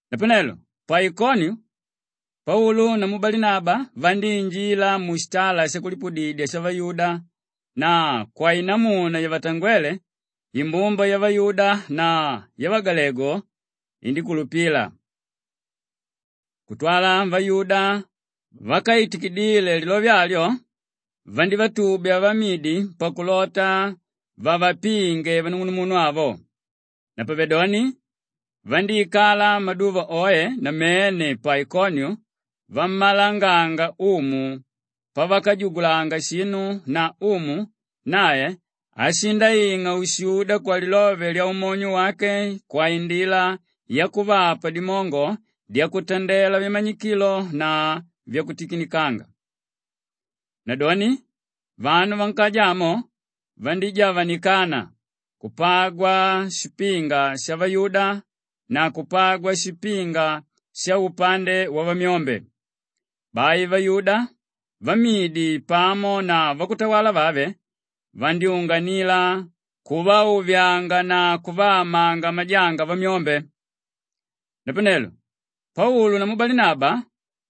Napanelo pa Ikoniu Paulu namu Balinaba vandíinjila mushitala shakulipudidya shavayuda na kwainamuna yavatangwele, imbumba yavayuda na yavagalegu indíkulupila. Kutwala vayuda vákaitikidile lilove alyo vandivatubya vamidi pakulota vavapinge vanung'unumunu avo. Napavedoni vandíikala maduva oe namene pa Ikoniu vammalanganga Umu pavakajugulanga shinu na Umu nae ashindaing'a ushuda kwalilove lyaumonyo wake kwaindila yakuvapa dimongo dyakutandela vimanyikilo na vyakutikinikanga. Nadoni vanu vankaja amo vandíjavanikana; kupagwa shipinga shavayuda na kupagwa shipinga shaupande wavamyombe. Bai vayuda, vamidi pamo na vakutawala vave, vandyúnganila kuvauvyauvyanga na kuvaamanga majanga vamyombe. Napanelo Paulu namu Balinaba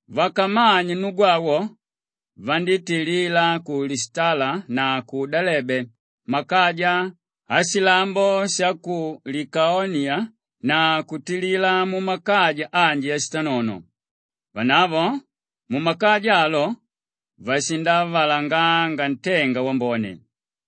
vakamanye nnugu awo, vandítilila ku Lishitala na ku Delebe makaja ashilambo sha ku Likaoniya na kutilila mumakaja anji ashitanono. Vanavo mumakaja alo, vashindavalanganga ntenga wambone.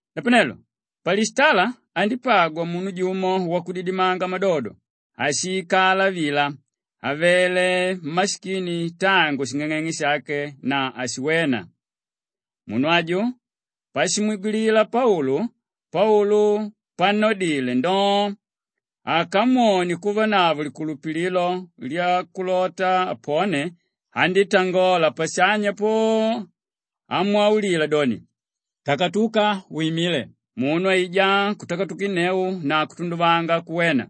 Napanelo pa Lishitala andípagwa munu jumo wakudidimanga madodo áshiikala vila, avele mmashikini tangu shing'ang'eng'e shake na ákashiwena. Munu aju pashimwigwilila Paulu; Paulu pannodile ndoo, akamwone kuvanavo likulupililo lyakulota apone, andítangola pashanya po, amwaulila doni, “Takatuka wimile!” Munu aijá kutakatukinneu na kutunduvanga kuwena.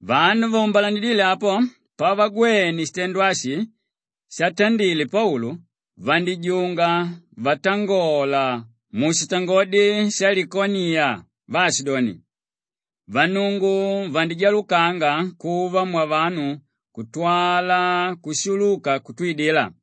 Vanu vaumbalanidíle apo pavagwene shitendo ashi shatandile Paulu, vandíjunga vatangola mushitangodi shalikaoniya vaashidoni, “Vannungu vandijalukanga kuva mwavanu kutwala kushuluka kutwidila!”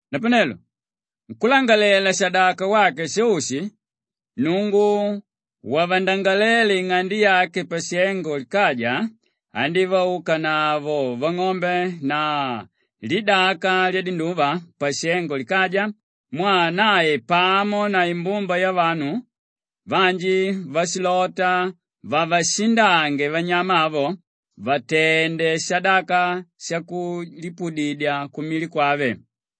Napanelo nkúlangalalela-shadaka wake Sheushi, nnungu wavandangaléle ing'ande yake pashengo likaja, andívaukanavo vang'ombe na lidaka lyadinduva pashengo likaja mwaa nae pamo na imbumba yavanu vanji vashilota vavashindange vanyama avo, vatende shadaka shakulipudidya kumili kwave.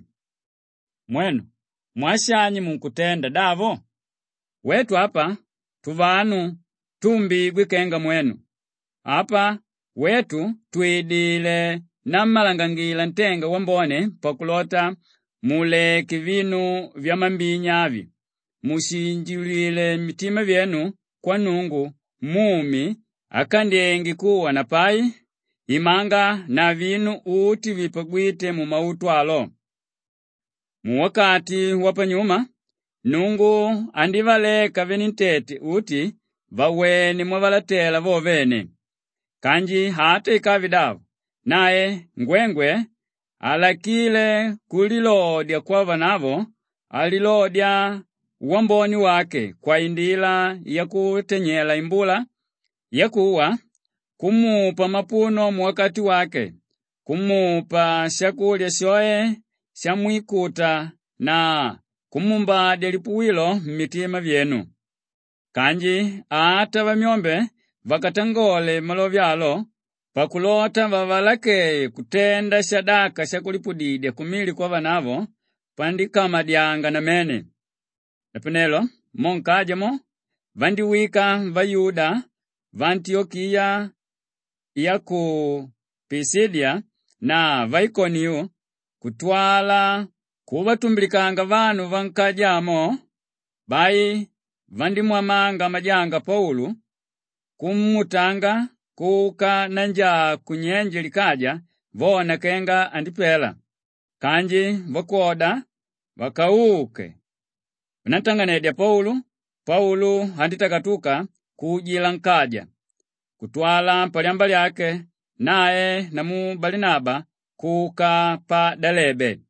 vaashidoni, “Mwenu, mwaa shani munkutenda davo? Wetu apa, tuvanu túumbigwe kenga mwenu; apa wetu twidilé nammalangangila ntenga wambone pakulota muleke vinu vyamambinya avi, mushinjiulile mitima vyenu kwa Nnungu mumi ákandyenge kuwa na pai, imanga na vinu uti vipagwíte mumautu alo. Muwakati wapanyuma, Nnungu andívaleka venentete uti vawene mwavalatela vo vene. Kanji ata ikave davo, nae ngwengwe halakíle kulilodya kwavanavo; andilodya wambone wake kwaindila yakuntanyela imbula yakuwa, kumupa mapuno muwakati wake, kumupa shakulya shoe shamwikuta na kumuumbadya lipuwilo mmitima vyenu.” Kanji ata vamyombe vakavatangalele malove alo pakulota vavalakeye kutenda shadaka shakulipudidya kumili kwavanavo pandíkamadyanga namene. Napanelo mo nkaja mo, vandíwika vayuda vaantiyokiya ya ku Pishidiya na vaikoniu kutwala kuvatumbilikanga vanu vankaja amo; bai vandímwamanga majanga Paulu, kumuutanga kuka nanjaa kunyenje likaja vona kenga andipela. Kanji vakwoda vakauke nantang'anedya Paulu, Paulu andítakatuka kuujila nkaja. Kutwala palyamba lyake nae namu Balinaba kuka pa Delebe.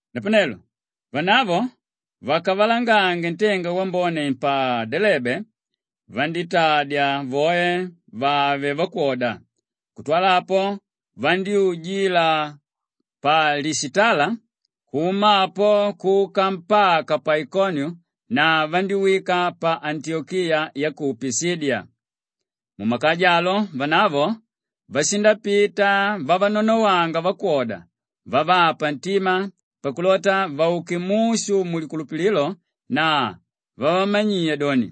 Napanelo vanavo vakavalangange ntenga wambone pa Delebe vandítadya voe vave vakwoda. Kutwala apo, vandyújila pa Lishitala, kuma apo kuka mpaka pa Ikoniu na vandíwika pa Antiyokiya ya ku Pishidiya. Mumakaja alo, vanavo vashindapita vavanonowanga vakwoda vavapa ntima pakulota vauke mushu mulikulupililo na vavamanyiya doni,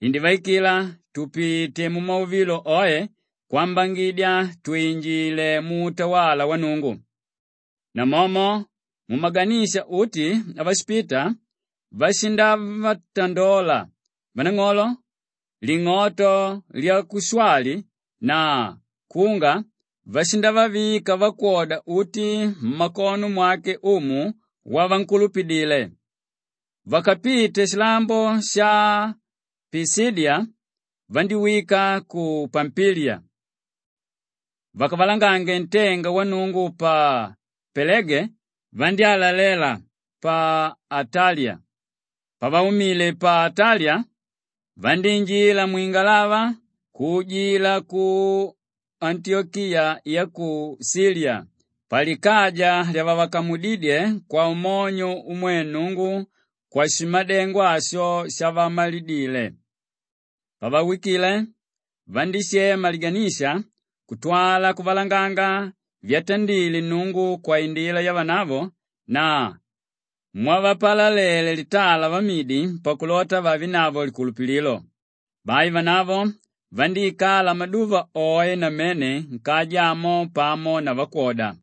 “Indivaikila tupite mumauvilo oe kwambangidya twinjile muutawala wa Nnungu.” Namomo mumaganisha uti avashipita, vashindavatandola vanang'olo; ling'oto lyakushwali na kunga vashindavavika vakwoda uti mmakono mwake Umu wavankulupidile. Vakapite shilambo sha Pishidiya vandíwika ku Pampiliya. Vakavalangange ntenga wa Nnungu pa Pelege vandyálalela pa Ataliya. Pavaumile pa Ataliya vandíinjila mwingalava kuujila ku Antiyokiya ya ku Shiliya palikaja lyavavakamudídye kwaumonyo umwe Nnungu kwashimadengo asho shavamalidile. Pavawikile, vandíshema liganisha kutwala kuvalanganga vyatandile Nnungu kwaindila yavanavo na mwavapalalele litala vamidi pakulota vavenavo likulupililo. Bai vanavo vandíikala maduva oe namene nkaja amo pamo na vakwoda.